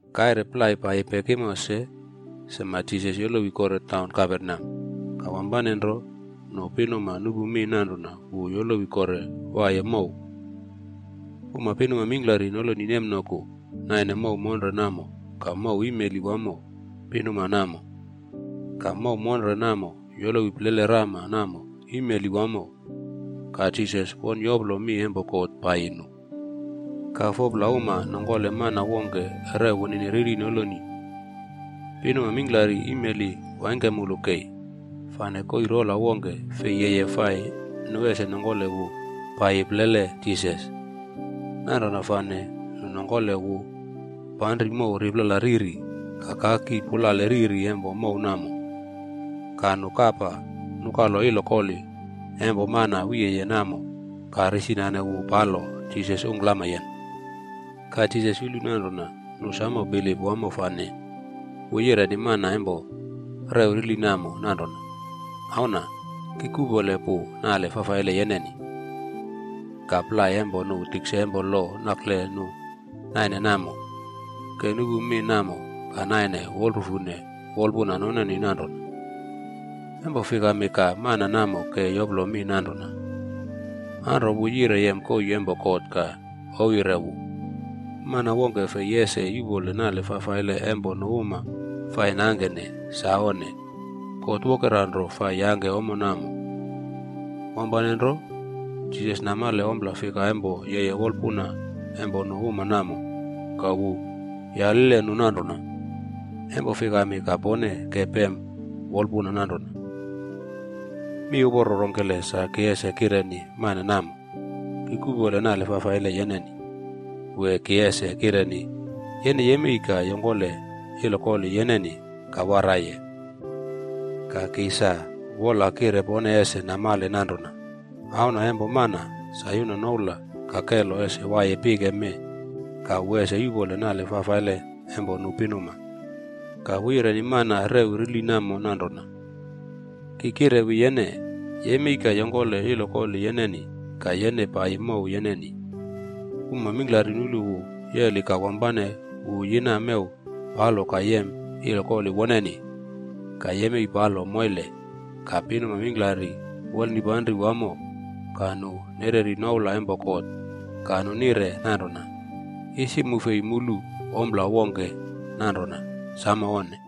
Kaire plai paiyi pekimo se, sema Jisas yolowi kore taun Kaperneam. Ka wampane nro nu pinuma nupu mi nanrona wu yolowi kore waiye mow. Uma pinuma mingklari noloni nemnoku naine mow monre namo ka mow imeli wamo pinuma namo. Ka mow monre namo yolowi plele rama namo imeli wamo. Ka Jisas won yoplo mi empo God paiyi nu. Ka 4pla uma nongkole mana wongke rew wunini rili noloni. Pinuma mingklari imeli waingkemulu kei, fane koii rola wongke fei yeye fai nu ese nongkole wu paiyi plele Jisas. Nanrona fane nu nongkole wu panri mow riplala riri ka kaki pulale riri empo mow namo. Ka nu kapa nukalo ilokoli empo mana wiye namo ka risinane wu palo Jisas ungklamyen. Ka Jisas yulu nanrona nu samo bilip wamo fane wu yireni mana empo rew rili namo nanrona, “Auna, ki kuꞌpole pu nale fafaile yeneni.” Ka plai empo nu tikse empo lo nakle nu naine namo, ke nupu mi namo ka naine wolrufune wolpuna noneni nanrona, “Empo fikami ka mana namo ke yoplo mi nanrona? Anro wu yire yem koii empo God ka ouwyire wu. Mana wongke ese fei yuꞌpole nale fafaile empo nu uma fai nangkene! Sa onne, God wokera nro fai yangke ommo namo.” Wampane nro Jisas namale ompla fika empo yeye wolpuna empo nu uma namo ka wu yaline nu nanrona, “Empo fikami ka pone ke pem wolpuna nanrona? Mi uporo rongkele sa ki ese kireni mana namo? ‘Ki kuꞌpole nale fafaile yeneni,’ wee ki ese kireni, ‘Yene yemei ka yongkole ilokoli yeneni ka waraiye’? Ka ki sa wola kire pone ese namale nanrona Auna Empo Mana sa yuna noula ka kelo ese waiye pike mee ka wu ese yuꞌpole nale fafaile empo nu pinuma.” Ka wu yireni mana rew rili namo nanrona, “Ki kirewi yene, yemei ka yongkole ilokoli yeneni ka yene paiyi mow yeneni.” Uma mingklari nulu wu yeli ka wampane wu yina mew palo ka yem ilokoli woneni ka yemei palo moile. Ka pinuma mingklari wolnipanri wamo ka nu nereri noula empo God ka nu nire nanrona, “Isi mu fei mulu ompla wongke nanrona. Samo onne!”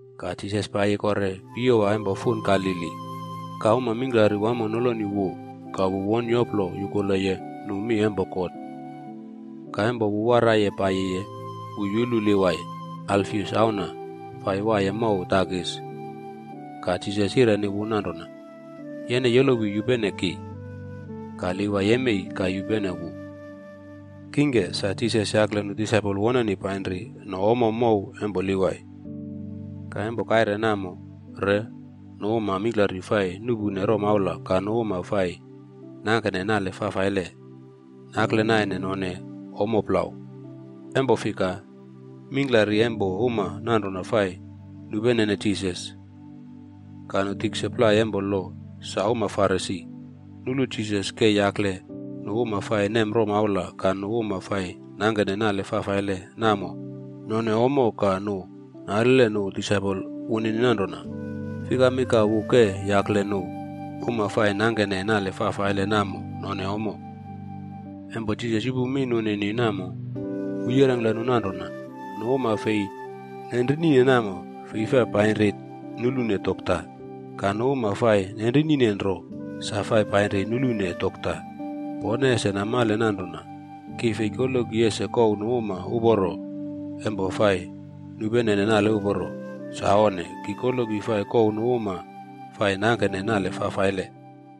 Ka Jisas paiyi kore piyowa empo fun Galili. Ka uma mingklari wamo noloni wu ka wu won yoplo yukuleye nu mi empo God. Ka empo wu waraiye paiyiye, wu yulu Livai, Alfius auna, fai waiye mow takis.a Ka Jisas yireni wu nanrona, “Yene yolowi yupene ki.” Ka Livai yemei ka yupene wu. Kingke, sa Jisas yakle nu disaipol wonenibpainri no ommo mow empo Livai. Ka empo kaire namo re, nu uma mingklari fai nuꞌpune romaula ka nu uma fai nangkene nale fafaile, nakle naine none ommo plau. Empo fika, mingklari empo uma nanrona fai nupenene Jisas. Ka nu tikse plai empo lo sa uma Farisi, nulu Jisas ke yakle nu uma fai nem romaula ka nu uma fai nangkene nale fafaile namo none ommo ka nu nalile nu disaipol wunini nanrona, Fikami ka wu ke yakle nu uma fai nuꞌpune romaula ka nu uma fai nangkene nale fafaile namo none ommo? Empo Jisas yupu mi nunini namo, wu yirengkle nu nanrona, “Nu uma fei nenrinine namo, fei fai painri nulune dokta. Ka nu uma fai nenrinine nro sa fai painri nulune dokta. Pone ese namale nanrona, ki fei koloki ese kouw nu uma uporo empo fai nupenene nale uporo. Sa onne. Ki koloki fai kouw nu uma fai nangkene nale fafaile.”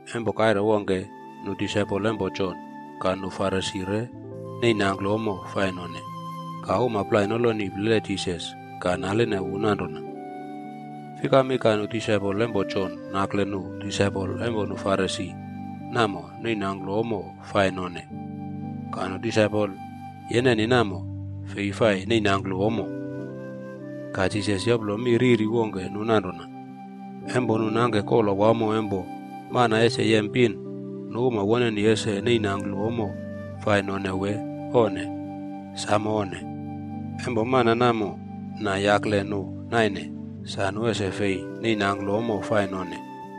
Empo kaire wongke, nu disaipol empo Jon ka nu Farisi re neinangklu ommo fai none. Ka uma plai noloni plele Jisas ka naline wu nanrona, “Fikami ka nu disaipol empo Jon nakle nu disaipol empo nu Farisi namo neinangklu ommo fai none, ka nu disaipol yeneni namo, fei fai neinangklu ommo?” Ka Jisas yoplo mi riri wongke nu nanrona, “Empo nu nangke kola wamo empo mana ese yem pin, nu uma woneni ese neinangklu ommo fai none wee onne? Sam onne! Empo mana namo na yakle nu naine, sa nu ese fei neinangklu ommo fai none.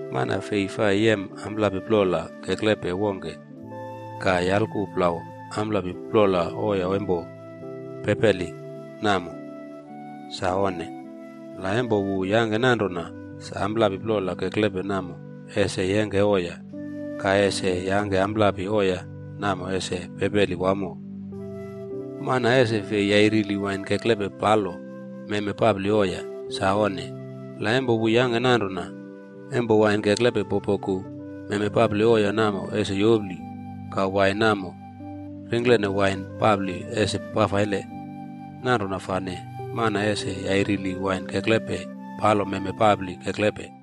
“Mana fei fai yem amplapi plola keklepe wongke ka yalku plau amplapi plola oiya empo pepeli namo. Sa onne! La empo wu yangke nanrona, sa amplapi plola keklepe namo ese yengke oiya, ka ese yangke amplapi oiya namo ese pepeli wamo. Mana ese fei yairili wain keklepe palo meme papli oiya. Sa onne! La empo wu yangke nanrona, empo wain keklepe popoku, meme papli oiya namo ese yopli. Ka wain namo ringklene wain papli ese fafaile. Nanrona fane, mana ese yairili wain keklepe palo meme papli keklepe.”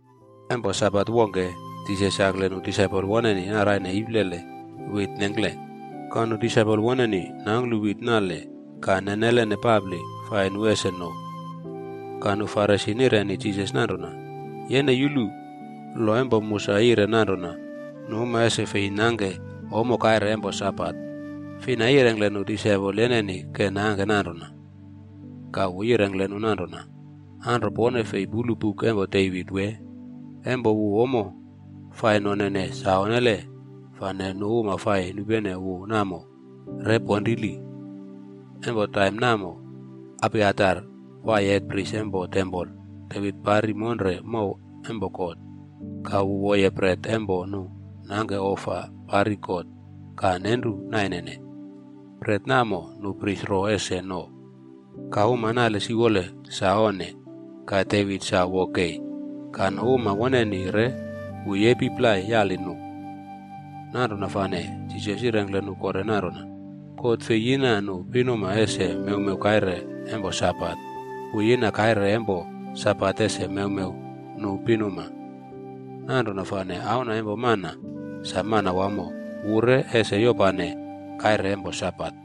Empo Sabat wongke, Jisas yakle nu disaipol woneni naraine iplele wit nengkle. Ka nu disaipol woneni nangklu wit nale ka nenelene papli fai nu ese no. Ka nu Farisi nireni Jisas nanrona, “Yene yulu, lo empo mu sa yire nanrona nu uma ese fei nangke ommo kaire empo Sabat. Fina yirengkle nu disaipol yeneni ke nangke nanrona?” Ka wu yirengkle nu nanrona, “Anro pone fei pulu buk empo Devit wee? Empo wu ommo fai nonene sa onnele fane nu uma fai nupene wu namo re ponrili. Empo taim namo Abiatar waiye hetpris empo tempol. Devit pari monre mow empo God, ka wu woye bret empo nu nangke ofa pari God ka nenru nainene. Bret namo nu pris ro ese no, ka uma nale siwole sa onne. Ka Devit sa wo kei, ka nu uma woneni re wu yepi plai yali nu.” Nanrona fane Jisas yirengkle nu kore nanrona, “God fei yina nu pinuma ese mewmew kaire empo Sabat. Wu yina kaire empo Sabat ese mewmew nu pinuma. Nanrona fane Auna empo Mana sa Manawamo, wu re ese yopane kaire empo Sabat.”